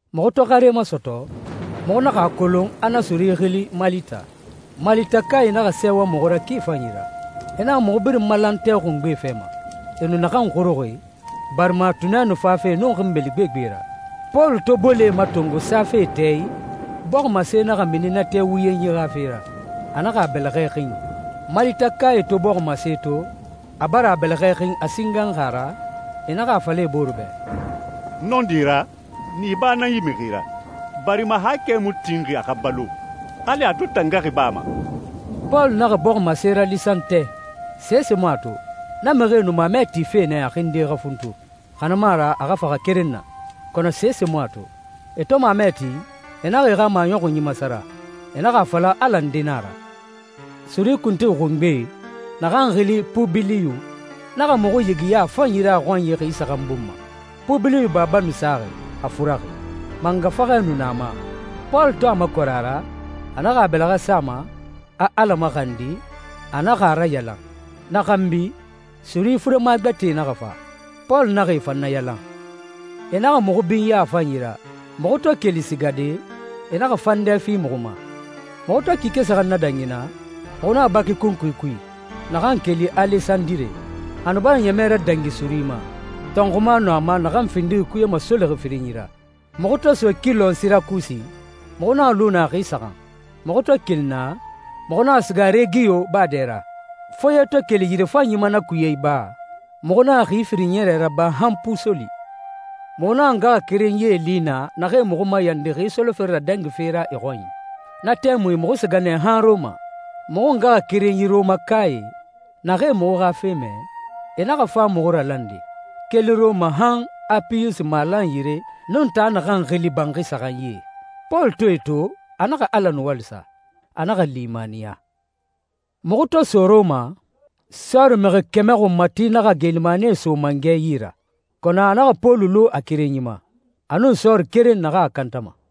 Muxu to xare masɔtɔ, muxu naxa a kolon a na suri xili Malita. Malitakae naxa sɛɛwa muxu ra ki fanyi ra. E naxa muxu birin malan tɛ xungbe fɛ ma, e nu naxan xuruxi, barima tunɛ nu fafe nun xinbeli gbegbe ra. Pɔlu to bolee matongo safe tɛ i, bɔximase naxa mini na tɛ wuyenyi xa fe ra, a naxa a bɛlɛxɛ xin. Malitakae to bɔximase to, a bara a bɛlɛxɛ xin a singanxi a ra, e naxa a fala e bore bɛ, «Nɔndi ra, niba nan yi mixi ra, barima haakɛ mu tinxi a xa balo, hali a to tangaxi baa ma.» Pɔlu naxa bɔximase ralisan tɛ, sese mu a to. Na mixie nu mamɛ tife nɛ a xinde xa funtu, xa na mu a ra a xa faxa keren na, kɔnɔ sese mu a to. E to mamɛ ti, e naxa e xa maɲɔxunyi masara. E naxa a fala ala nde nan a ra. Suri kuntigi xungbe, naxan xili Pubiliyu, naxa muxu yigiya a fanyi ra a xɔnyi xi saxan bun ma. Pubiliyu baba nu saxi, a furaxi, mangafaxɛ nu na a ma. Pɔlu to a makɔrɛ a ra, a naxa a bɛlɛxɛ sa a ma, a Ala maxandi, a naxa a rayalan. Na xanbi, suri furema gbɛtɛe naxa fa, Pɔlu naxa e fan nayalan. E naxa muxu binya a fanyi ra. Muxu to keli sigade, e naxa fandɛ fi muxu ma. Muxu to kike saxan nadangi naa, muxu naxa baki kunkui kui, naxan keli Alesandire. A nu bara ɲɛmɛ radangi suri ma. Tɔnxuma nu a ma naxan findixi kuye masolixi firinyi ra. Muxu to so kilɔn Sirakusi, muxu naxa lu naa xi saxan. Muxu to keli naa, muxu naxa siga Regiyo baa dɛ ra. Foye to keli yirefanyi ma na kuye iba, muxu naxa xi firin ɲɛrɛ raba han Pusoli. Muxu naxa ngaxakerenyie li naa naxee muxu mayandi xi solofere radangife ra e xɔnyi. Na tɛmui muxu siga nɛ han Rɔma. Muxu ngaxakerenyi Rɔmakae, naxee muxu xa fe mɛ, e naxa fa muxu ralande, keli Rɔma han Apiyusi malan yire nun taa naxan xili Banxi Saxanyie. Pɔlu to e to a naxa Ala nuwali sa, a naxa limaniya. Muxu to so Rɔma, sɔɔri mixi kɛmɛ xunmati naxa geelimanie so mangɛ yi ra, kɔnɔ a naxa Pɔlu lu a kerenyi ma, a nun sɔɔri keren naxan a kantama.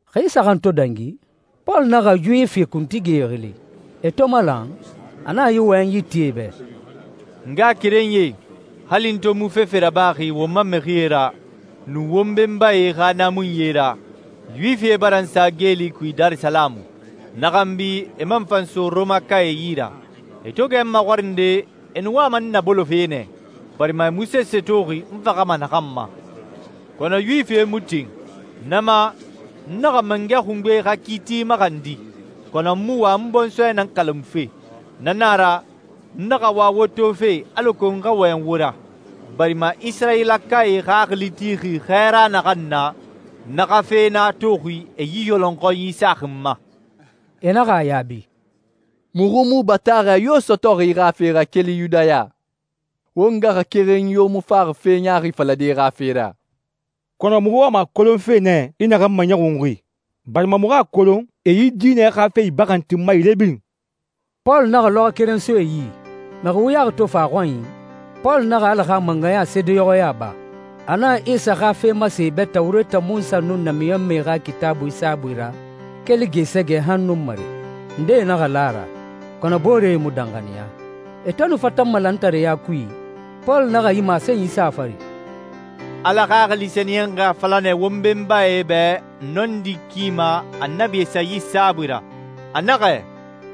Xi saxan to dangi, Pɔlu naxa Yuwifi kuntigie xili. E to malan, a naxa yi wɔyɛnyi ti e bɛ, «N ngaxakerenyie, hali n to mu fefe rabaxi won ma mixie ra, nun won benbae xa naamunyie ra, Yuwifie bara n sa geeli kui Darisalamu, na xanbi e man fa n so Rɔmakae yi ra. E to gɛ n maxɔrinde, e nu wama n nabolofe nɛ, barima e mu sese toxi n faxama naxan ma. Kɔnɔ Yuwifie mu tin. Na ma, n naxa mangɛ xungbe xa kiiti maxandi, kɔnɔ n mu wa n bɔnsɔɛ nan kalamufe. Na na a ra, n naxa wa wo tofe alako n xa wɔyɛn wo ra, barima Isirayilakae xaxili tixi xɛɛra naxan na, na xa fe nan a toxi e yi yɔlɔnxɔnyi saxi n ma.» E naxa a yaabi, «Muxu mu bataaxɛ yo sɔtɔxi i xa fe ra keli Yudaya. Won ngaxakerenyi yo mu faxi fe ɲaaxi falade i xa fe ra. Kɔnɔ, muxu wama a kolonfe nɛ i naxan maɲɔxunxi, barima muxu a kolon e yi diinɛ xa fe ibaxantinma yire birin.» Pɔlu naxa lɔxɔɛ keren so e yi. Mixi wuyaxi to fa a xɔnyi, Pɔlu naxa Ala xa mangɛya seedeɲɔxɔya ba. A naxa Isa xa fe masen e bɛ Tawureta Munsa nun namiɲɔnmɛe xa Kitaabui saabui ra keli gɛɛsɛgɛ han nunmare. Ndee naxa la a ra, kɔnɔ booree mu danxaniya. E to nu fatanma lantareya kui, Pɔlu naxa yi masenyi sa a fari, «Ala Xaxili Sɛniyɛnxi a fala nɛ wo benbae bɛ nɔndi ki ma Annabi Esayi saabui ra. A naxɛ,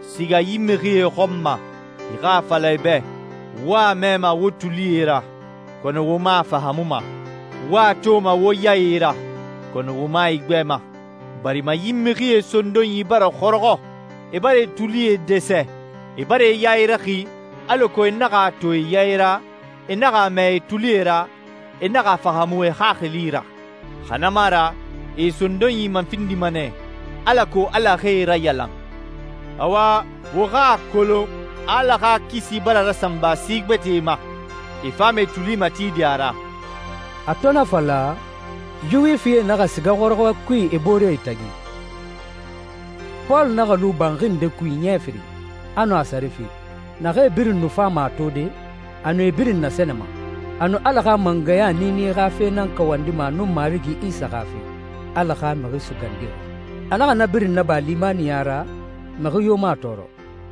‹Siga yi mixie xɔn ma, i xa a fala e bɛ: “Wo a mɛma wo tulie ra, kɔnɔ wo mu a fahaamuma. Wo a toma wo yae ra, kɔnɔ wo mu a igbɛma.” Barima yi mixie sondonyi bara xɔrɔxɔ. E bara e tulie dɛsɛ. E bara e yae raxi, alako e naxa a to e yae ra, e naxa a mɛ e tulie ra, e naxa a fahaamu e xaxili ra. Xa na mu a ra e e sondonyi mafindima nɛ, alako Ala xa e rayalan.›» «Awa, wo xa a kolon a Ala xa kisi bara rasanba si gbɛtɛe ma. E fama e tuli matide a ra.» A to na fala, Yuwifie naxa siga xɔrɔxɔɛ kui e booree tagi. Pɔlu naxa lu banxi nde kui ɲɛ firin, a nu a sare fi. Naxee birin nu fama a tode, a nu e birin nasɛnɛma. A nu Ala xa mangɛya niini xa fe nan kawandima a nun Marigi Isa xa fe, Ala xa Mixi Sugandixi. A naxa na birin naba limaniya ra, mixi yo mu a tɔɔrɔ.